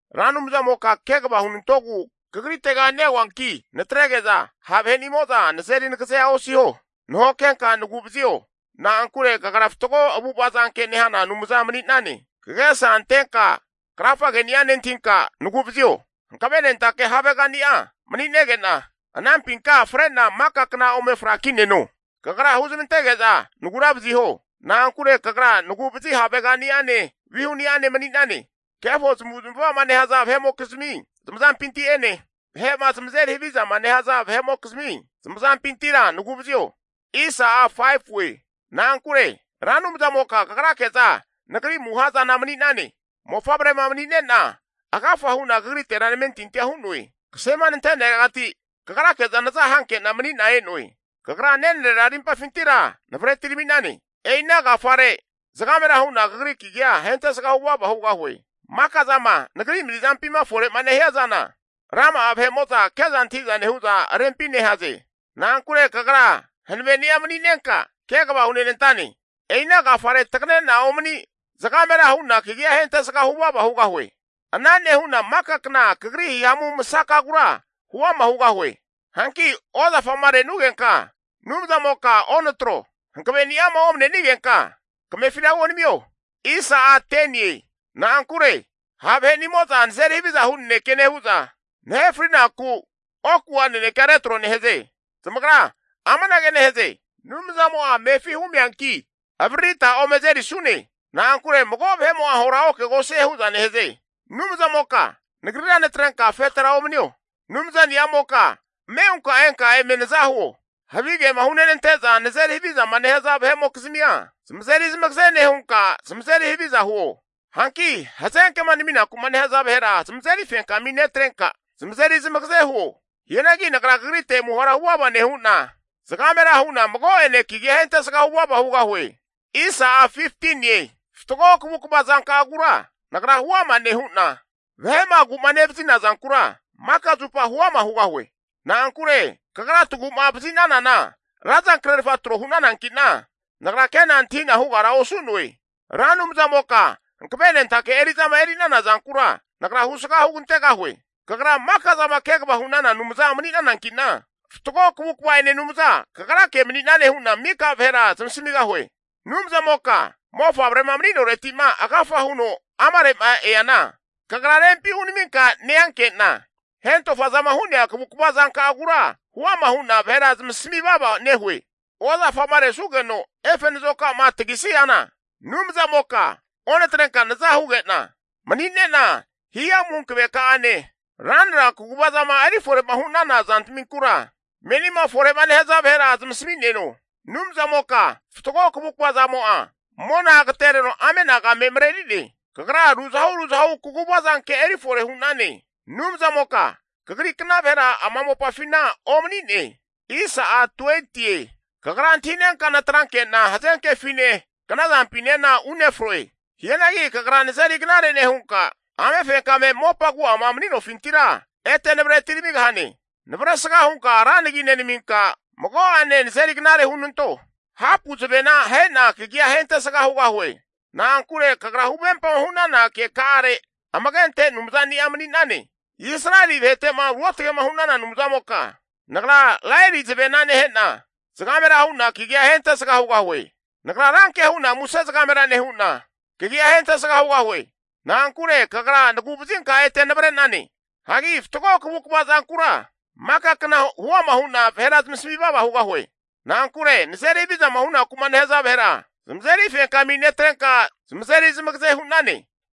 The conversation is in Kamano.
Ra Anumzamoka kegava hunantogu Kagritega neoanki, natrege'za ha' vahenimo'za nazeri nagazea osiho. Nahokenka nagu'vazio, na'ankure Kagra fatgo avu'ava zanke nehana Anumza mani'nane. Kagesa antenka krafageni'a nentahinka nagu'vazio. Hanavenentake havegani'a mani'nege'na anampinka fre'na maka kna ome frakineno. Kagra huzmantege'za nagura vaziho. Na'ankure Kagra nagu'vazi havegani'ane vihuni'ane mani'nane. Kefo zamavu'zmava'ma nehaza vahe'mokizmi zamazampinti'ene, vahe'ma zamazeri havizama nehaza vahe'mokizmi zamazampintira nagu'vazio. Na'ankure Ra Anumzamoka kagrake'za nagri amuha zani'a mani'nane. Mofavrema mani'nena agafa hu'na kagritera namentintia hu'noe. Kasema nanteneregati kagrake'za naza hankena mani'na e'noe. Kagra nenarera arimpafintira navre atirami'nane. E'ina agafare zagamera hu'na Kagri kagia ahentesga huvava hugahue. Maka zama nagri mani'zampima fore'ma nehia zana, rama'a vahe'mo'za ke'za antahi'za nehu'za rempi nehaze. Na'ankure kagra hanaveni'a mani'nenka, kegava hunenantane. E'ina agafare tagane'na omani zagamera hu'na kagi'a ahentesga huvava hugahue. Ana nehu'na maka kna kagri hihamu masakagura huama hugahue. Hanki ozafama renugenka Anumzamoka onatro. Hankaveni'ama omanenigenka kamefira huonamio. Na'ankure ha' vahe'nimo'za nazeri haviza hu naneke nehu'za, nahe frinaku oku'a nanekea retro nehaze. Zamagra amanage nehaze, Anumzamo'a amefi humianki, avaririta ome azerisune. Na'ankure mago vahe'mo'a ahora okegosie hu'za nehaze. Anumzamoka nagrira natrenka afetera omanio. Anumzani'amoka ame hunka enka eme naza huo. Havigema hunante'za nazeri havizama nehaza vahe'mokizmia, zamazeri zamagaze nehunka zamazeri haviza huo. Hanki hazenkema naminaku'ma nehaza vahera zamazeri fenkami netrenka, zamazeri zamagaze huo. Hianagi nagra kagrite amuhara huvava nehu'na, zagamera hu'na mago'ene kagia ahentesga huvava hugahue. Fatgo kavukava zanka'agura nagra huama nehu'na, vahe'ma agu'ma nevazina zankura maka zupa huama hugahue. Na'ankure kagra tagu'ma vazi'nanana ra zankrefa tro hu'nanankina, nagra ke'na antahina hugara osu'noe. Ra Anumzamoka hanavenentake eri'zama eri'nana zankura nagra husga hugantegahue. Kagra maka'zama kegava hu'nana Anumzana mani'nanankina, fatgo kavukava'ene Anumza kagrake mani'nane hu'na mika vahera zamasmigahue. Anumzamoka mofavrema mani'noretima agafa huno amare'ma eana, Kagra rempi hunaminka neanke'na hentofazama hu'nea kavukva zanka'agura huama hu'na vahera zamasami vava nehue. Ozafama resugeno efe nazoka'ma tagisiana, Anumzamoka onatrenka naza huge'na mani'nena, hihamu hankaveka'ane, ranra kaguvazama erifore'ma hu'nana zantminkura, menima fore'ma nehaza vahera zamasmi'neno. Anumzamoka fatgo kavukva zankamo'a mona agatereno ame'anagema mareri'ne. Kagra ruzahu ruzahu kaguva zanke erifore hu'nane. Anumzamoka kagri kna vahera ama mopafina omani'ne. Kagra antahinenka natranke'na hazenkefine knazampinena unefroe. Hianagi kagra nazeri knare nehunka, amefenkame mopa agu'ama mani'nofintira ete navre atiramigahane. Navresga hunka ra nagi nenaminka, mago'ane nazeri knare hunanto. Hapu zavena ahena kagia ahentesga hugahue. Na'ankure kagra huvempama hu'nana keka'are amage ante Anumzani'a mani'nane. Israeli vahete'ma Ruotge'ma hu'nana Anumzamoka, nagra laeri zavena nehe'na zagamera hu'na kagia ahentesga hugahue. Nagra ranke hu'na muse zagamera nehu'na, Kagia ahentesga hugahue. Na'ankure kagra nagu'vazinka ete navre'nane. Hagi fatgo kavukva zanka'agura maka kna huama hu'na vahera zamasami vava hugahie. Na'ankure nazeri havizama hunaku'ma nehaza vahera zamazeri fenkami netrenka zamazeri zamagaze hu'nane.